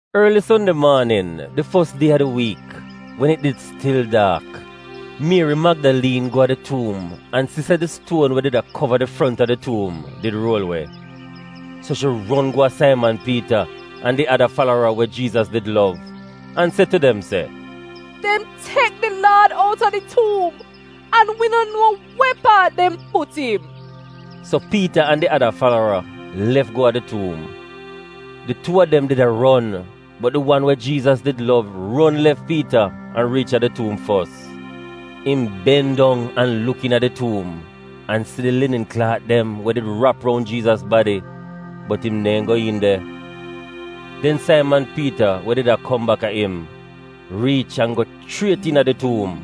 Orli Sonde maanin, di fos die a di wiik, wen it did stil daak, Mieri Magdaliin go a di tuum an si se di stuon we did a kova di front a di tuum did ruol we. So shi ron go a Saiman Piita an di ada falara we Jiizas did lov, an se tu dem se, “Dem tek di Laad outa di tuum, an wi no nuo we paat dem put im!” So Piita an di ada falara lef go a di tuum. Di tuu a dem did a ron, bot di wan we Jiizas did lov ron lef Piita an riich a di tuum fos. Im ben dong an luk iina di tuum an si di linin klaat dem we did rap roun Jiizas badi, bot im neehn go iin de. Den Saiman Piita we did a kom baka im, riich an go chriet iina di tuum.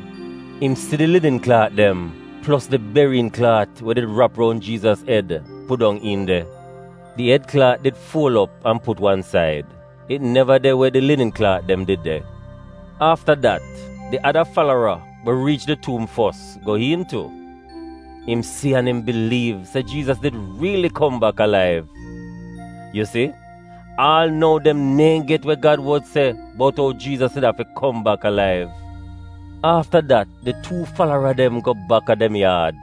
Im si di linin klaat dem, plos di beriyin klaat we did rap roun Jiizas ed pudong iin de. Di ed klaat did fuol op an put wan said. It neva de we di linin klaat dem did de. Afta dat, di ada falara, we riich di tuum fos go iin tu. Im si an im biliiv se Jiizas did riili kom bak alaiv. (Yu si, aal nou dem neehn get we Gad wod se bout ou Jiizas did afi kom bak alaiv.) Afta dat di tuu falara dem go baka dem yaad.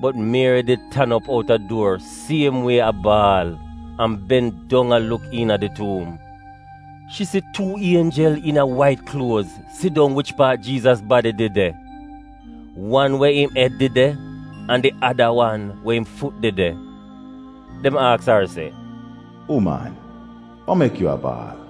Bot Mieri did tan op outa duor siem wie a baal, an ben dong a luk iina di tuum. Shi si tuu ienjel iina wait kluoz sidong wich paat Jiizas badi did de — wan we im ed did de an di ada wan we im fut did de. Dem aks ar se, “Uman, wa mek yu a baal?”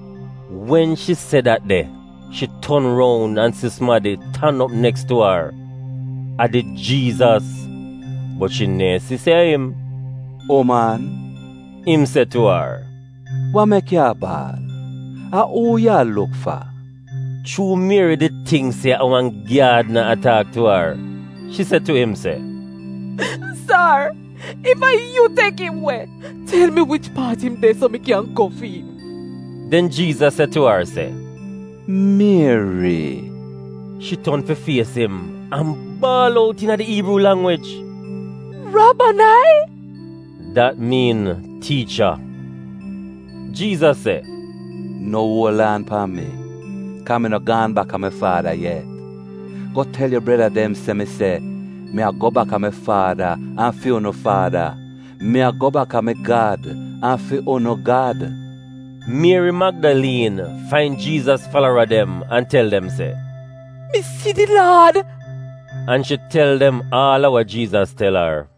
Wen shi se dat de, shi ton roun an si sumadi tan op neks tu ar — a did Jiizas — bot shi neehn si se a im. “Uman,” im se tu ar, “wa mek yu a baal? A uu yu a luk fa?” Chuu Mieri did tingk se a wan gyaadna a taak tu ar, shi se tu im se, “Sar, ef a yu tek im we, tel mi wich paat im de, so mi kyan go fi'im.” Den Jiizas se tu ar se, “Mieri!” Shi ton fi fies im an baal out iina di Iibruu langwij, “Rabonai!” (dat miin Tiicha). Jiizas se, “No uol aan pan mi, kaa mi no gaan baka mi Faada yet. Go tel yu breda dem se mi se, ‘Mi a go baka mi Faada an fi unu Faada, mi a go bak a mi Gad an fi unu Gad.’” Mieri Magdaliin fain Jiizas falara dem an tel dem se, “Mi si di Laad!” An shi tel dem aal a wa Jiizas tel ar.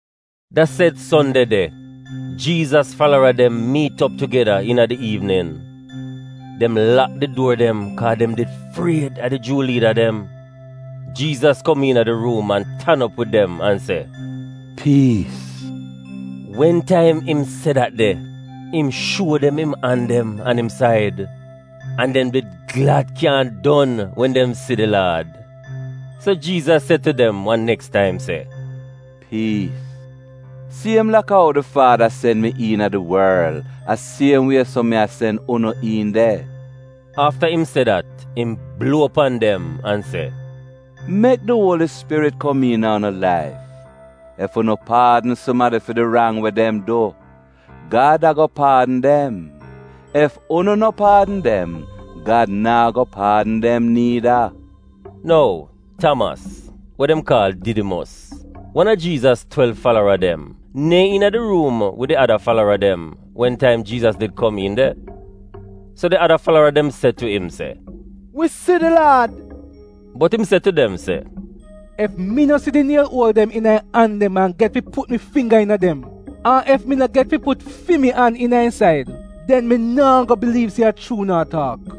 Da sed Sonde de, Jiizas falara dem miit op tugeda iina di iivnin. Dem lak di duor dem kaa dem did fried a di Juu liida dem. Jiizas kom iina di ruum an tan op wid dem an se, “Piis!” Wen taim im se dat de, im shuo dem im an dem an im said. An dem did glad kyaahn don wen dem si di Laad. So Jiizas se tu dem wan neks taim se, “Piis! Siem laka ou di Faada sen mi iina di worl, a siem wie so mi a sen unu iin de.” Afta im se dat im bluo pan dem an se, “Mek di Uoli Spirit kom iina unu laif. Ef unu paadn sumadi fi di rang we dem du, Gad ago paadn dem; ef unu no paadn dem, Gad naa go paadn dem niida.” Nou, Tamas (we dem kaal Didimos), wan a Jiizas twelv falara dem neehn iina di ruum wid di ada falara dem wen taim Jiizas did kom iin de. So di ada falara dem se tu im se, “Wi si di Laad!” Bot im se tu dem se, “Ef mi no si di niel uol dem iina im an dem an get fi put mi fingga iina dem, an ef mi no get fi put fi mi an iina im said, den mi naa go biliiv se a chuu unu a taak.”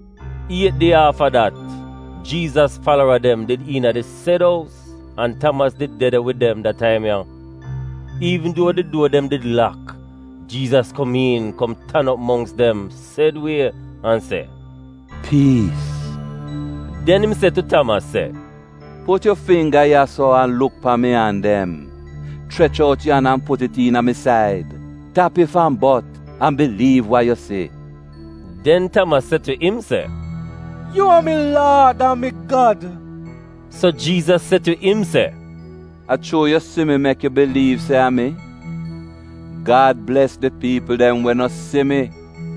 Iet die aafa dat, Jiizas falara dem did iina di sed ous, an Tamas did de de wid dem da taim ya. Iivn duo di duor dem did lak, Jiizas kom iin kom tan op mongks dem sed wie an se, “Piis!” Den im se tu Tamas se, “Put yu fingga ya-so an luk pan mi an dem. Chrech out yu an an put it iina mi said. Tap ef an bot, an biliiv wa yu si.” Den Tamas se tu im se, “Yu a mi Laad an mi Gad!” So Jiizas se tu im se, “A chuu yu si mi mek yu biliiv se a mi? Gad bles di piipl dem we no si mi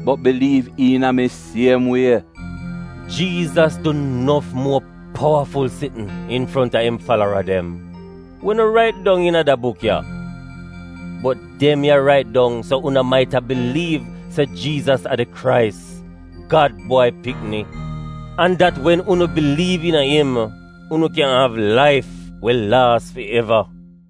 bot biliiv iina mi siem wie.” Jiizas du nof muo powaful sitn infronta im falara dem, we no rait dong iina da buk ya. Bot dem ya rait dong so unu maita biliiv se Jiizas a di Krais, Gad Bwai Pikni, an dat wen unu biliiv iina im, unu kyan av laif we laas fi eva.